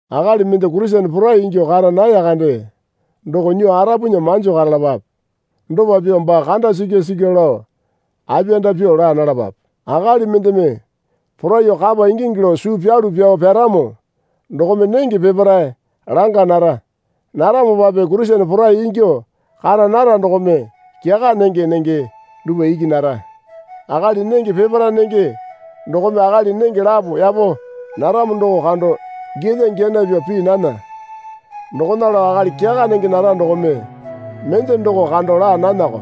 Akali mende Kurisene porai ingyuo kara naya kande doko nyuo arapunya manjo karalapape. Dopa pyuo baa kanda sikya sikyuo lao apiyanda pyo laa nalapape. Akali mendeme poraiyuo kapa ingingi lao suu pyalu pyao pyaramo dokome nenge peparae langa nara. Naramopape Kurisene porai ingyuo kara nara dokome kyaka nenge nenge dupwa iki nara. Akali nenge peparae nenge dokome akali nenge lapo yapo naramo doko kando giyalya giyana pyuo pii nana. Dokona lao akali kyaka nenge nara dokome mende doko kando laa nanako.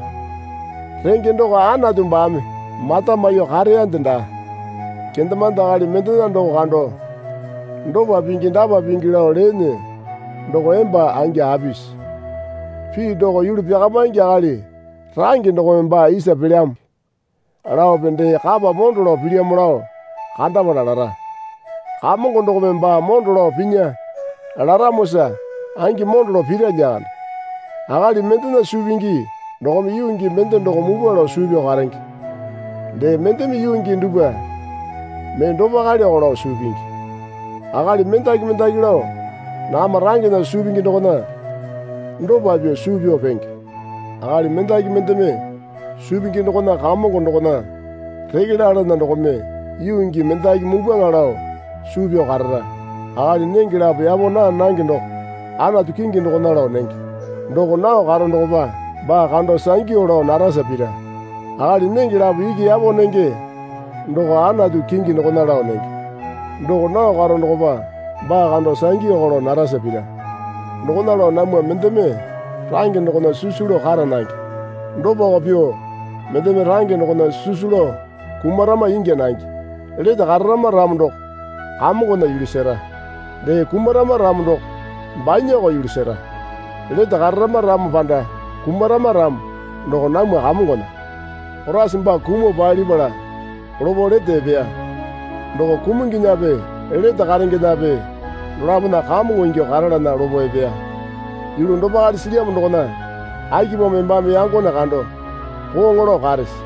Renge doko Anatu baame mata maiyuo kareyande daa. Kendemande akali mendena doko kando dopa pingi dapa pingi lao leene doko emba angi apisi? Pii doko yulu pyakamaingi akali range dokome baa isa pelyamo laope dee kapa mondo lao pilyamo lao kandapala lara, Kamongo dokome baa mondo lao pinya laramosa angi mondo lao pira lyakande. Akali mendena suu pingi dokome yuu gii mende doko mupwa lao suu pyao karenge. Dee mendeme yuu gii dupwa mee dopaleko lao suu pingi. Akali mendaki mendaki lao nakama rangena suu pingi dokona dopa pyuo suu pyao penge. Akali mendaki mendeme suu pingi dokona Kamongo dokona reke lalana dokome yuu gii mendaki mupwaŋa lao suu pyao karara. Akali nenge lapo yapo naa nange doko Anatu kingi dokona lao nenge. Doko nao karo dokopa baa kando sangyu lao narasa pira. Akali nenge lapo iki yapo nenge doko Anatu kingi dokona lao nenge. Doko nao karo dokopa baa kando sangyuko lao narasa pira. Dokona lao namwa mendeme range dokona sisu lao kara nange. Dopako pyuo mendeme range dokona sisu lao kumarama ingya nange. Lete kararama ramo doko Kamongona yulu sera. Dee kumarama ramo doko banyako yulu sera. Lete kararama ramo panda kumarama ramo doko namwa Kamongona. Koraisa baa kumuo palipala lopo lete epeya. Doko kumunginyape lete karengenape dolapona Kamongo ingyuo karalana lopo epeya. Yulu dopale silyamo dokona akipamo embame yangone kando kooŋo lao karese?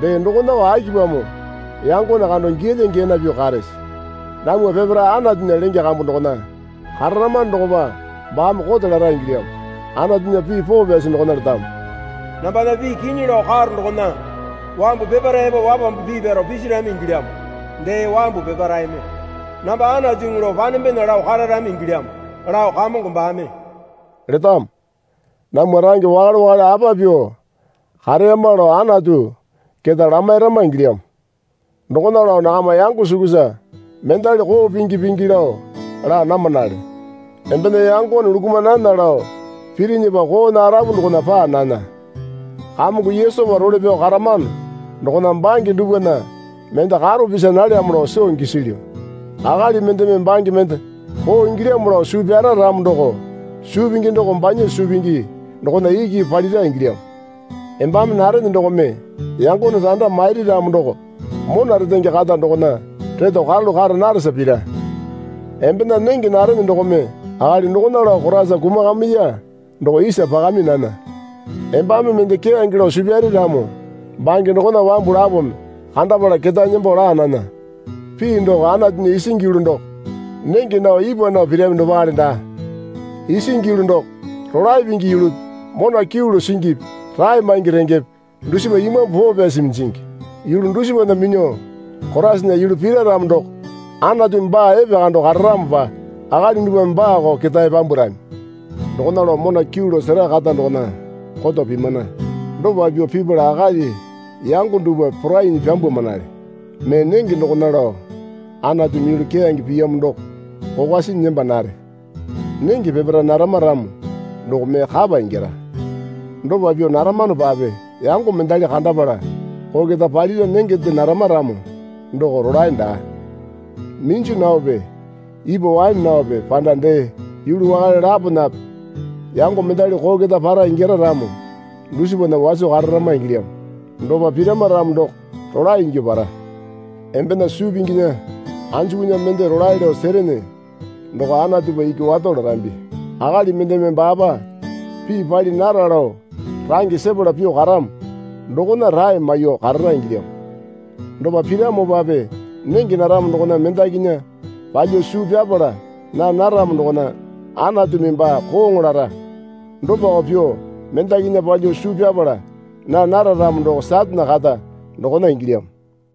Dee dokonako akipamo yangone kando giyalya giyana pyuo karese? Namwa peparae Anatunya lenge kambu dokona kararamano dokopa baame kote lara ingilyamo. Anatunya pii poo pyasi dokona letamo. Nambana pii kinyi lao karo dokona wambu peparae epo wapambu pii pyaro pisirami ingilyamo. Dee wambu peparaeme namba Anatuŋu lao panembena lao kararami ingilyamo lao Kamongo baame letamo. Namwa range wakale wakale apa pyuo kareyama lao Anatu keta lamairama ingilyamo. Dokona lao nakama yango sukusa mendali koo pingi pingi lao laa namanale. Embena yangone lukuma nana lao pirinyipa koona arapu dokona paa nana. Kamongo Yesupa role pyao karamano dokona bange dupwana mende karo pisa nalyamo lao soo gisilyu. Akali mendeme bange mende koo ingilyamo lao suu pyara ramo doko suu pingi doko banya suu pingi dokona iki palira ingilyamo. Embame narene dokome yangone randa mairi ramo doko mona retenge kata dokona reto karalu kara naresa pira. Embena nenge narene dokome akali dokona lao Koraisa kumakamiya doko isa pakami nana. Embame mende keyange lao suu pyare ramo bange dokona wambu lapome kandapala ketae nembo laa nana. Pii doko Anatunya isingi yulu doko nenge nao ipwa nao pirami dopale daa. Isingi yulu doko rolae pingi yulupi mona kyuu lao singipi rae maingi rengepe dusipa Imambu Poo Pyasimi jingi. Yulu dusipana minyuo Koraisana yulu pira ramo doko Anatumi baa epekando kararamopa akali dupwame baako ketae pyambwarami. Dokona lao mona kyuu lao sera kata dokona koto pimana. Dopa pyuo pipala akali yango dupwa porainyi pyambwamanale. Mee nenge dokona lao Anatumi yulu keyange piyamo doko kokwa sinyi nembo nare. Nenge peparae narama ramo doko mee kapa ingyara. Dopa pyuo naramanopape yango mendali kandapala koo keta palira nengende narama ramo doko rolae daa. Minju naope ipwa waene naope panda dee yulu wakale laponape yango mendali koo keta para ingyara ramo dusipana waso kararama ingilyamo. Dopa pirama ramo doko rolae ingyuo para. Embena suu pinginya anjukunya mende rolae lao serene doko Anatupa iki wato larambi. Akali mendeme baapa pii pali nara lao range sepala pyuo karamo dokona rae maiyuo karara ingilyamo. Dopa piramopape nenge naramo dokona mendakinya palyuo suu pyapala naa naramo dokona Anatumi baa kooŋo lara. Dopako pyuo mendakinya palyuo suu pyapala naa nara ramo doko Satane kata dokona ingilyamo.